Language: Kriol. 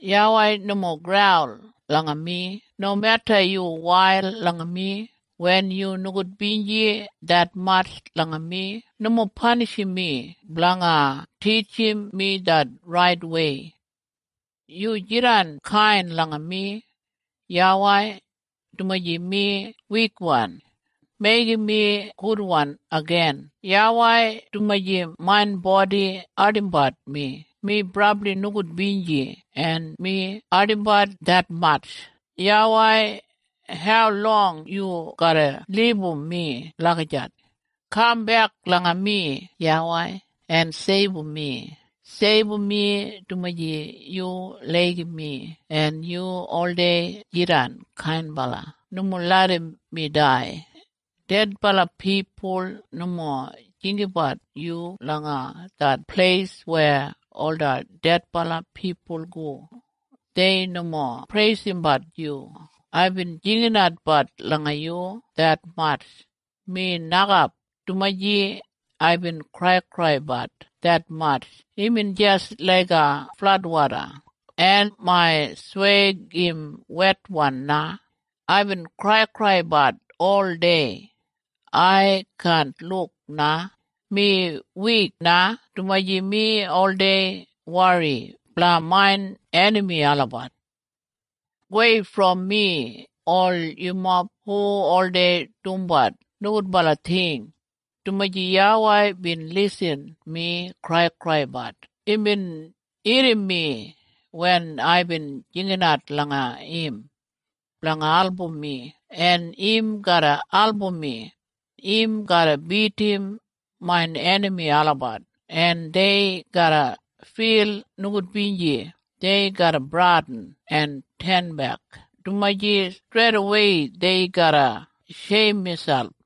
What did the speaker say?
YAWEI, nomo graul langa mi, nomeda yu wail langa mi. Wen yu nogudbinji detmatj langa mi, nomo panishim mi blanga titjim mi det raitwei. Yu jidan kain langa mi, YAWEI, dumaji mi wikwan. Meigim mi gudwan igin, YAWEI, dumaji main bodi ardimbat mi. Mi brabli nogudbinji en mi ardimbat detmatj. YAWEI, haulong yu garra libum mi lagijat? Kambek langa mi, YAWEI, en seibum mi. Seibum mi dumaji yu laigim mi en yu oldei jidan kainbala. Nomo larram mi dai. Dedbala pipul nomo jinggabat yu langa det pleis weya ola dedbala pipul go. Dei nomo preisimbat yu. Aibin jinginatbat langa yu detmatj mi nokap. Dumaji aibin kraikraibat detmatj imbin jis laiga fladwoda, en main sweig im wetwan na. Aibin kraikraibat oldei. Ai kaan luk na. Mi wik na dumaji mi oldei wori blanga main enami olabat. Gowei brom mi, ol yumob hu oldei dumbat nogudbala ting, dumaji YAWEI bin irrim mi kraikraibat. Imbin irrim mi wen aibin jingat langa im blanga album mi, en im garra album mi. Im garra bidim main enami olabat, en dei garra fil nogudbinji. Dei garra bradin en tenbek, dumaji streidawei dei garra sheim miselp.